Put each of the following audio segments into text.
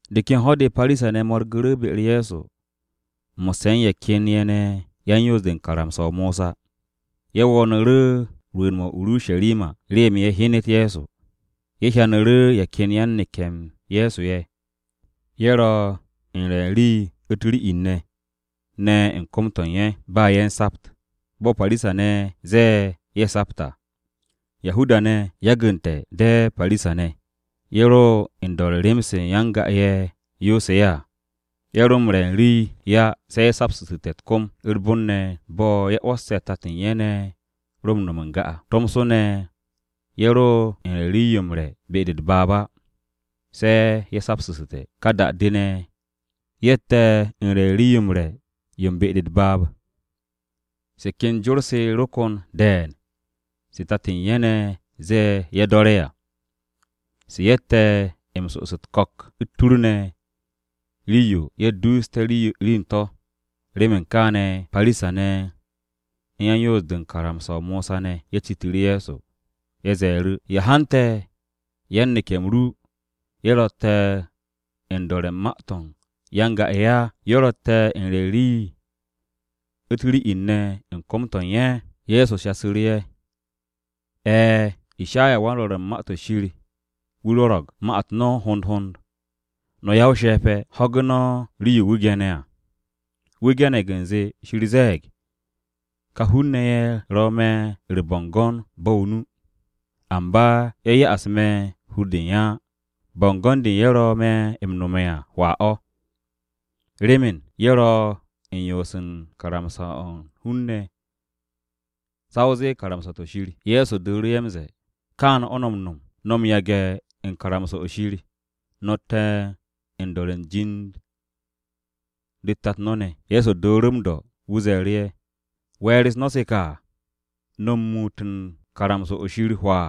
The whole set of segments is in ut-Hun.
De ken ho̱-de, Parisa-ne̱ mo̱rgu̱ru̱ be-u̱r Ye̱so mo̱sse̱ u̱n ye̱ ken ye̱ ne̱ yan-Yoos-de u̱n karamsa-o Mosa. Ye̱ wo̱o̱nu̱ru̱ rwu̱u̱n-mo̱ o-Urusharima remen ye̱ hyenet Ye̱so. Ye̱ hyanu̱ru̱ ye̱ ken yan-neke̱-m Ye̱so ye̱. Ye̱ ro u̱n re̱ u̱n rii u̱t-ri'in ne̱ u̱n kom-to̱ u̱n ye̱, ba ye̱ u̱n sapt, bo̱ Parisa-ne̱ ze̱e̱ ye̱ ye̱ sapt à. Yahuda-ne̱, yagu̱nte̱ de̱ Parisa-ne̱, ye̱ ro u̱n do̱re̱ u̱n rem-se ya-n-ga-ye̱ yoose̱ ye̱ à. Ye̱ ro m-re̱ u̱n rii á, se̱ ye̱ saptu̱ssu̱te̱ u̱t-kom u̱r-bon ne̱ bo̱ ye̱ 'wo̱sse̱ tat u̱n ye̱ ne̱ ro m-no̱m n-ga à. Tomso ne̱ ye̱ ro u̱n re̱ u̱n rii-yo m-re̱ be-de u̱t-baab á, se̱ ye̱ saptu̱ssu̱te̱. Ka da-de ne̱ ye̱tte̱ u̱n re̱ u̱n rii-yo m-re̱ yo u̱n be-de u̱t-baab. Se ken jor-se ro kon de̱e̱n se tat u̱n ye̱ ne̱ ze̱e̱ ye̱ do̱re̱ à. Se ye̱tte̱ m-so'os u̱t-ko̱k, u̱t-tur ne̱, rii-yo ye̱ duuste̱ rii u̱n to̱. Remen kaane̱, Parisa-ne̱ u̱n yan-Yoos-de u̱n karamsa-o Mosa ne̱ ye̱ citu̱ru̱ Ye̱so. Ye̱ ze̱e̱ru̱, “¿Ya hante̱ yan-neke̱-m ru ye̱ ro̱tte̱ u̱n do̱re̱ u̱n jor-se ya-n-ga-ye̱ á? Ye̱ ro̱tte̱ u̱n re̱ u̱n rii u̱t-ri'in ne̱ u̱n kom-to̱ u̱n ye̱.” Ye̱so shasu̱ru̱ ye̱, “E̱e̱, Ishayawan-Rwo̱r u̱n Ma-to̱ Shir wu̱ rwo̱ro̱g ma-u̱t no̱ hond hond, no̱ ya-o-she̱pe̱! Ho̱ge̱ no̱ rii-yo wu̱ ge̱ne̱ à. Wu̱ ge̱ne̱g u̱nze, Shir ze̱e̱g, “ ‘Ka hun-ne̱ ye̱ ro̱ me̱ u̱r-bo̱ngo̱n bo̱ o-nu, amba ye̱ ya'as me̱ hur-de u̱n ye̱ á. Bo̱ngo̱n-de ye̱ ro̱ me̱ m-nome̱ à, hwaa o̱. Remen, ye̱ ro̱ u̱n yoos u̱n karamsa-o̱ u̱n hun-ne̱ sa o zee karamsa-to̱ Shir.’” Ye̱so dooru̱ ye̱ m-ze̱e̱, “Kaane̱ o̱ no̱ m-no̱m. No̱ m-yage̱ u̱n karamsa-o̱ Shir, no̱tte̱ u̱n do̱re̱ u̱n jor-u̱s tat no̱ ne̱.” Ye̱so dooru̱ m-do̱, wu̱ ze̱e̱ru̱ ye̱, “¿We̱e̱r-u̱s no̱ se ka? No̱ m-muut u̱n karamsa-o̱ Shir hwaa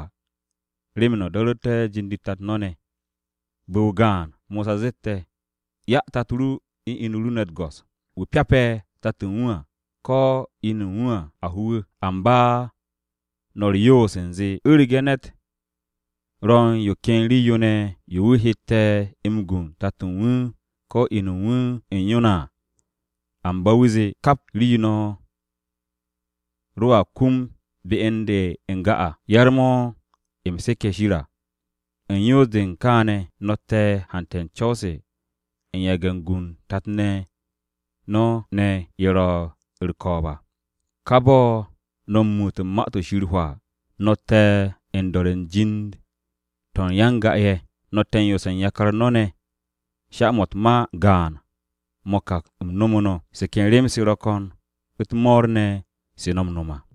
remen no̱ do̱ru̱te̱ jor-u̱s tat no̱ ne̱! Bu̱-o gaan, Mosa zeste̱, ‘Ya tato ru u̱n inu ru ne̱ u̱t-go̱s. Wu̱ pyape̱ tat u̱n wu̱ à, ko̱ inu u̱n wu̱, a ho wu̱.’ Amba no̱ u̱r-yoos u̱nze u̱rege̱ ne̱t ro̱ u̱n yo ken rii-yo ne̱ yo wu̱ heete̱ m-gu u̱n tato u̱n wu̱ ko̱ inu u̱n wu̱ u̱n yo à, amba wu̱a zee, ‘Kap rii-yo no̱ roa kum be u̱n de n-ga à, yar-mo̱ mo̱ u̱m seke̱ Shir à.’ U̱n yoos-de u̱n kaane̱, no̱tte̱ u̱n hante̱ u̱n co̱w-se u̱n yage̱ u̱n gu u̱n tat no̱ ne̱ ye̱ ro̱ u̱r-ko̱o̱b à. Ka bo̱ no̱ m-muut u̱n Ma-to̱ Shir hwaa. No̱tte̱ u̱n do̱re̱ u̱n jor-se u̱n ya-n-ga-ye̱. No̱tte̱ u̱n yoose̱ u̱n yakar no̱. Sha-mo̱ u̱n ma-u̱t gaan-mo̱ ka u̱m nomu̱ no̱. Se ken rem-se ro̱ ko̱n u̱t-mo̱o̱r ne̱ se no̱ m-no̱m à.”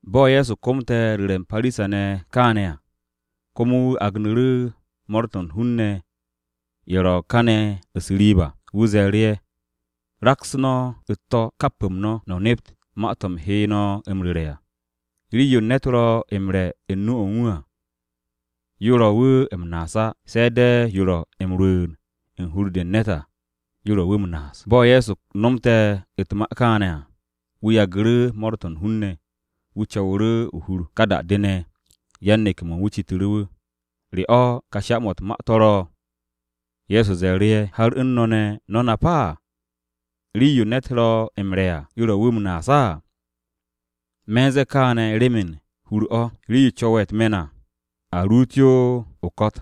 Bo̱ Ye̱so komte̱ ru̱re̱ u̱n Parisa-ne̱ kaane̱ à, komo wu̱ agnu̱ru̱ mo̱o̱r-to̱ u̱n hun-ne̱ ye̱ ro kane̱ u̱s-riib à. Wu̱ ze̱e̱ru̱ ye̱, “Raks no̱ u̱t-to̱, kap-m no̱, no̱ nep ma-to̱ u̱m he no̱ m-ru̱re̱ à. Rii-yo ne̱t ro̱ m-re̱ u̱n nu-o̱ u̱n wu̱ à, yo ro̱ wu̱ m-naas á, se̱ de̱ yo ro̱ m-rwu̱u̱n u̱n hur-de u̱n ne̱t à, yo ro̱ wu̱ m-naas.” Bo̱ Ye̱so nomte̱ u̱t-ma kaane̱ à, wu̱ yagu̱ru̱ mo̱o̱r-to̱ u̱n hun-ne̱, wu̱ co̱wu̱ru̱ o-hur. Ka da-de ne̱, yan-neke̱-mo̱ u̱n wu̱ citu̱ru̱ wu̱, “¿Re o̱, ka sha-mo̱ u̱t-ma to̱ ro̱?” Ye̱so ze̱e̱ru̱ ye̱, “¿Har u̱n no̱ ne̱, no̱ nap á? Rii-yo ne̱t ro̱ m-re̱ à, yo ro̱ wu̱ m-naas á. Me̱ u̱n ze̱e̱ kaane̱ remen u̱r-hur o̱, yo co̱we̱ á, u̱t-me̱n o̱, yo co̱we̱. Rii-yo co̱we̱ u̱t-me̱n à, a ruut yo o-ko̱t.”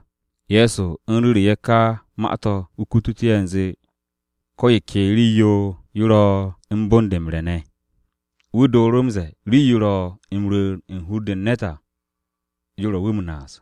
(Ye̱so u̱n ru̱ru̱ ye̱ ka ma-to̱ wu̱ kututu̱ ye̱ u̱nze ko̱ yo ke rii-yo yo ro̱ u̱n bon-de m-re̱ ne̱.) Wu̱ dooru̱ m-ze̱e̱, “Rii-yo ro̱ m-rwu̱u̱n u̱n hur-de u̱n ne̱t à, yo ro̱ wu̱ m-naas.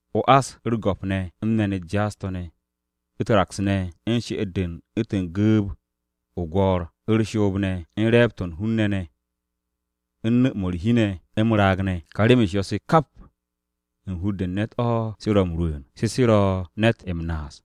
o-ás, u̱r-go̱p ne̱, u̱n me̱n-u̱t jaas-to̱ ne̱, u̱t-raks ne̱, u̱r-she'et ne̱ u̱ntu̱n gu̱u̱b-o̱ o-gwo̱o̱r, u̱r-shoob ne̱, u̱n re̱e̱b-to̱ u̱n hun-ne̱ ne̱, u̱n nu̱-mo̱ u̱r-hi ne̱, u̱n m-raag ne̱. Ka rem-u̱s yo̱-se se kap, u̱n hur-de u̱n ne̱t o̱, se ro̱ m-rwu̱u̱n. Se se ro̱ ne̱t m-naas.”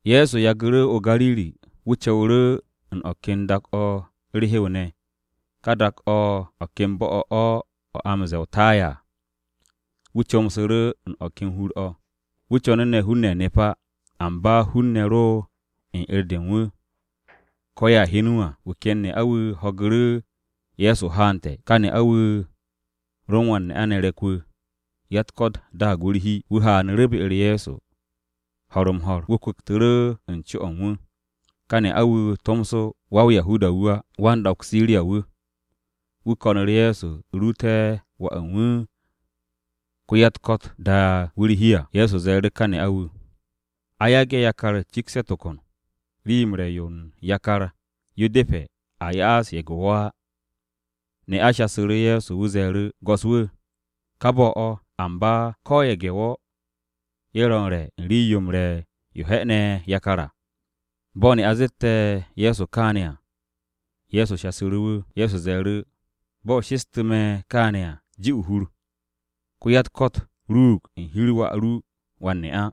Ye̱so yagu̱ru̱ o-Gariri, wu̱ co̱wu̱ru̱ u̱n o̱ ken dak-o̱ u̱r-hew ne̱, dak-o̱ u̱n o̱ ken bo̱-o̱ o̱ a m-ze̱e̱ o-Taya à. Wu̱ comsu̱ru̱ u̱n o̱ ken hur-o̱. Wu̱ co̱nu̱ ne̱ hun-ne̱ nep á. Amba hun-ne̱ ro̱ u̱n 'er-de u̱n wu̱ ko̱ ye̱a hyen wu̱ à. Wu̱ ken ne'a-wu̱ ho̱gu̱ru̱ Ye̱so haante̱. Ka ne'a-wu̱ wu̱ ro u̱n wan-ne'a ne̱ re̱k-wu̱, ya-u̱t-ko̱t daag wu̱ u̱r-hi. Wu̱ haanu̱ru̱ be-u̱r Ye̱so ho̱r-m-ho̱r. Wu̱ kwu̱ktu̱ru̱ u̱n co-o̱ u̱n wu̱. Ka ne'a-wu̱ tomso, ko-ya-o-Yahuda wu̱ á, ko-ya u̱n dak-o̱ o-Siriya wu̱. Wu̱ ko̱nu̱ru̱ Ye̱so ruute̱ wà u̱n wu̱ ko-ya-u̱t-ko̱t ye̱ da'e̱ wu̱ u̱r-hi à. Ye̱so ze̱e̱ru̱ ká ne'a-wu̱, “A yage̱ yakar cikste̱ tokon. Rii-yo m-re̱ yo u̱n yakar, yo depe̱ a ya'as ye̱ge̱-wo̱ á.” Ne'a shasu̱ru̱ Ye̱so, wu̱ ze̱e̱ru̱, “Go̱s-wu̱, ka bo̱ o̱, amba ko̱ ye̱ge̱-wo̱, ye̱ ro̱ u̱n re̱ u̱n rii-yo m-re̱ yo he̱'e̱ne̱ yakar à.” Bo̱ ne'a zette̱ Ye̱so kaane̱ à, Ye̱so shasu̱ru̱ wu̱. Ye̱so ze̱e̱ru̱, “Bo̱ o shestu̱ me̱ kaane̱ à, ji o-hur, ko-ya-u̱t-ko̱t ruug u̱n hi-u̱r wà ru wan-ne'a.”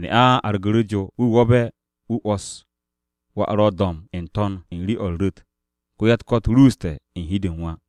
Ne'a argu̱ru̱ jo. Wu̱ wo̱be̱, wu̱ 'wo̱s wà ro do̱mb n-to̱n u̱n rii-o̱ u̱r-ru̱t. Ko-ya-u̱t-ko̱t ruuste̱ u̱n hi-de u̱n wà.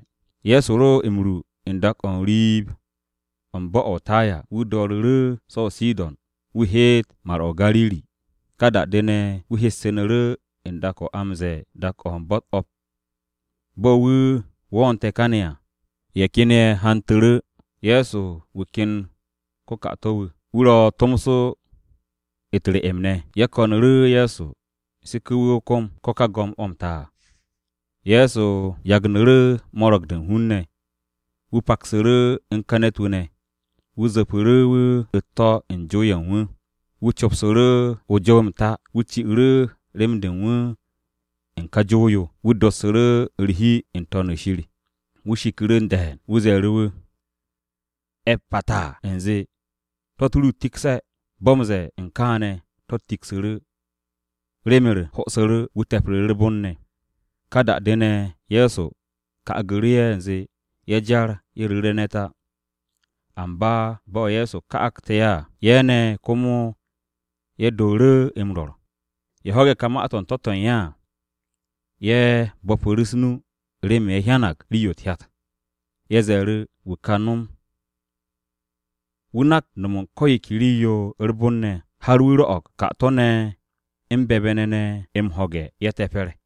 Ye̱so ro m-ru u̱n dak-o̱ u̱n riib-o u̱n bo̱-o̱ o-Taya, wu̱ do̱ru̱ru̱ so̱ o-Sidon wu̱ heet Mar-o̱ o-Gariri. Ka da-de ne̱, wu̱ hessu̱nu̱ru̱ u̱n dak-o̱ a m-ze̱e̱ dak-o̱ u̱n Bo̱-u̱t O̱p. Bo̱ wu̱ wo̱o̱nte̱ kane̱ à, ye̱ ken ye̱ hantu̱ru̱ Ye̱so wu̱ ken ko-ka'ato̱-wu̱. Wu̱ ro̱ tomso u̱t-re'em ne̱. Ye̱ ko̱nu̱ru̱ Ye̱so seke̱ wu̱ o-kom, ko̱ ka go̱m-o̱ m-ta à. Ye̱so yagnu̱ru̱ mo̱ro̱g-de u̱n hun-ne̱. Wu̱ paksu̱ru̱ u̱n ka ne̱t-wu̱ ne̱. Wu̱ zu̱pu̱ru̱ wu̱ u̱t-to̱ u̱n jow-ye̱ u̱n wu̱. Wu̱ copsu̱ru̱ o-jow m-ta. Wu̱ ci'u̱ru̱ rem-de u̱n wu̱ u̱n ka jow-yo. Wu̱ dassu̱ru̱ u̱r-hi n-To̱n o̱ shir. Wu̱ shiku̱ru̱ de̱e̱n. Wu̱ ze̱e̱ru̱ wu̱, “E̱phaphatha” u̱nze, “To̱-u̱t ru tikse̱.” Bo̱ m-ze̱e̱ u̱n kaane̱ to̱-u̱t tiksu̱ru̱. Rem-u̱r ho'osu̱ru̱. Wu̱ te̱pru̱ru̱ u̱r-bon ne̱. Ka da-de ne̱, Ye̱so ka'agu̱ru̱ ye̱ u̱nze ye̱ jar ye̱ ru̱re̱ ne̱t á. Amba bo̱ Ye̱so ka'agte̱ ye̱ à, ye̱ ne̱ komo ye̱ dooru̱ m-rwo̱r. Ye̱ ho̱ge̱ ka ma-to̱ u̱n to̱-to̱ u̱n ye̱ à, ye̱ bo̱pu̱ru̱ u̱s-nu remen ye̱ hyanag rii-yo u̱t-hyat. Ye̱ ze̱e̱ru̱, “Wu̱ nak no̱m u̱n ko̱ yo ke rii-yo u̱r-bon ne̱ har wu̱ rwo̱'o̱g ka'ato̱-ne̱ u̱n be̱be̱-ne̱ m-ho̱ge̱, ye̱ te̱pe̱r.”